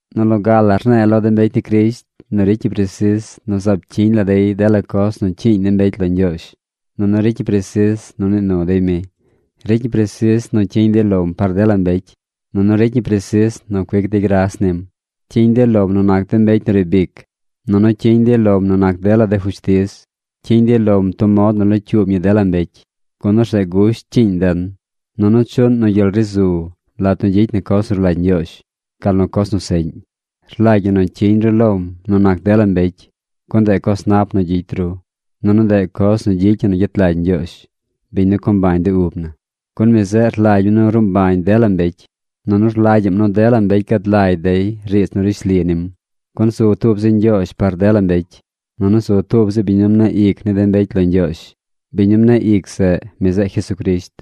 Nu loga la rne̱e̱ lo de mbecy ni Crisht nu ricy ñi presis nu zaab cyiñ la dey dela coz nu cyiiñ ni mbecy lo Ñgyoozh. Nunu ricy ñi presis nu nii nu dey mi. Ricy ñi presis nu cyiñ dey lom par dela mbecy. Nunu ricy ñi presis nu cuic dey gras nim. Cyiñ dey lom nu nac de mbecy nu riib ic. Nunu cyiñ dey lom nu nac dela de fushtiz. Cyiñ dey lom tub mod nu locyuub ñi dela mbecy. Gun orzeꞌ gusht cyiiñ den, nunu chuꞌn nu gyel ri zu lat nu gyicy na coz nu rlagy Ñgyoozh, gal nu coz nu seꞌñ. Rlagy ñi nu cyiñ ru lom nu nac dela mbecy, gun ndeꞌ coz nap nu gyicy ru, nunu ndeꞌ coz nu gyicy ñi nu gyet lagy Ñgyoozh, biñ nu co mbañ de ub na. Gun mi zeꞌ rlagy mi nu ruu mbañ dela mbecy, nunu rlagyaꞌm nu dela mbecy gad lagy dey riidz nu rishli nim. Gun zu tub zi Ñgyoozh par dela mbecy. Nunu zu tub zi biñ nu mneꞌ ic ni de mbecy lo Ñgyoozh. Biñ nu mneꞌ ic zeꞌ, mi zeꞌ Jesucrisht.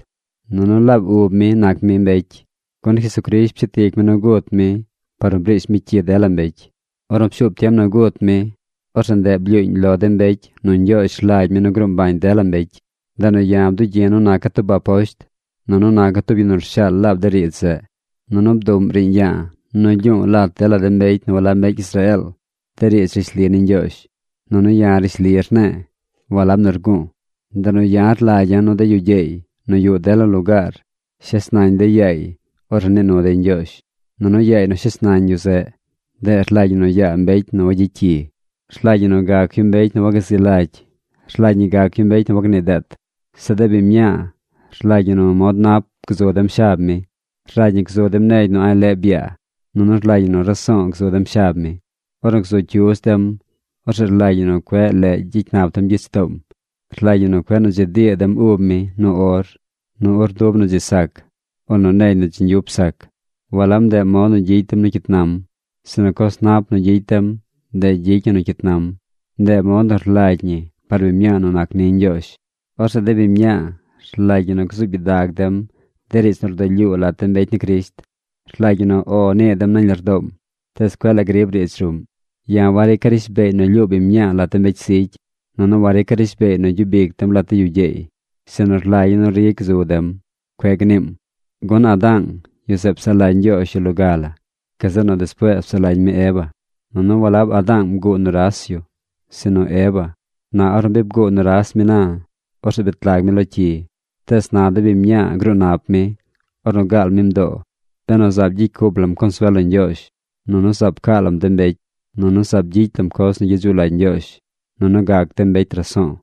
Nunu laab ub mi nac mi mbecy. Gun Jesucrisht pshet ic mi nu gut mi par nu briish mi cyi dela mbecy. Ornu pshuub tiem nu gut mi, orzeꞌ ndeꞌ blyuuñ lo de mbecy nu Ñgyoozh rlagy mi nu gruu mbañ dela mbecy. Ndeꞌ nu ya̱ bdugyi̱ nu naca̱ tub aposht, nunu naca̱ tub yu nu rshaal laab de riidz zeꞌ. Nunu bduꞌm riiñ ya̱a̱ nu lyu̱u̱ lat dela mbecy nu walab mbecy Israeel de riidz rishli ni Ñgyoozh. Nunu ya̱ rishli rne̱e̱, walab nu rgu̱u̱. Ndeꞌ nu ya̱ rlagya̱ nu de yu gyeey nu yuꞌ dela lugaar shes nañ dey yaay ornu nii nu dey Ñgyoozh. Nunu yaay nu shes nañ yu zeꞌ, ndeꞌ rlagy ñi nu yaa mbecy nu wayicy cyi. Rlagy ñi nu gac yu mbecy nu wagazi lagy. Rlagy ñi gac yu mbecy nu wagnii deet. Zeꞌ de biñ mñaa rlagy ñi nu mod nap gzu dem shab mi. Rlagy ñi gzu dem negy nu a̱ꞌ leꞌ byaa, nunu rlagy ñi nu raso̱o̱ gzu dem shab mi. Ornu gzu cyudz dem, orzeꞌ rlagy ñi nu cueꞌ leꞌ gyicy nap dem gyich toom. Rlagy ñi nu cueꞌ nu dzi dii dem ub mi nu or, nu urndub nu dzi sac, o nu negy nu dzi ñgyup sac. Walab ndeꞌ mod nu gyicy dem nu cyit nam, sinu coz nap nu gyicy dem, ndeꞌ gyicy ñi nu cyit nam. Ndeꞌ mod nu rlagy ñi par biñ mñaa nu nac ni Ñgyoozh. Orzeꞌ de biñ mñaa rlagy ñi nu gzuub gyidag dem de riidz nu rdulyuu lat de mbecy ni Crisht. Rlagy ñi nu “O” nii dem nañ lardoom, tees cueꞌ la grib riidz ruꞌm. Ya̱ warica̱ rishbeey nu lyuu biñ mñaa lat mbecy zigy. Nunu warica̱ rishbeey nu gyub ic dem lat de yu gyeey. Sinu rlagya̱ nu ri gzub dem. Cueꞌ gniim. Gun Adaang, yu zeꞌ psaꞌ lagy Ñgyoozh yu loga la. Gazeꞌ nu despuees psaꞌ lagy mi Eva. Nunu walab Adaang bguu nuras yu, sinu Eva. Na ornu bi bguu nuras mi na, orzeꞌ bet lag mi lo cyi. Tees na de biñ mñaa gruu nap mi, ornu gaal mi mdoo, benu zaab gyicy cup lam consuel lo Ñgyoozh, nunu zaab caa lam de mbecy, nunu zaab gyicy lam coz nu gyedzuꞌ lagy Ñgyoozh, nunu gac dem mbecy raso̱o̱.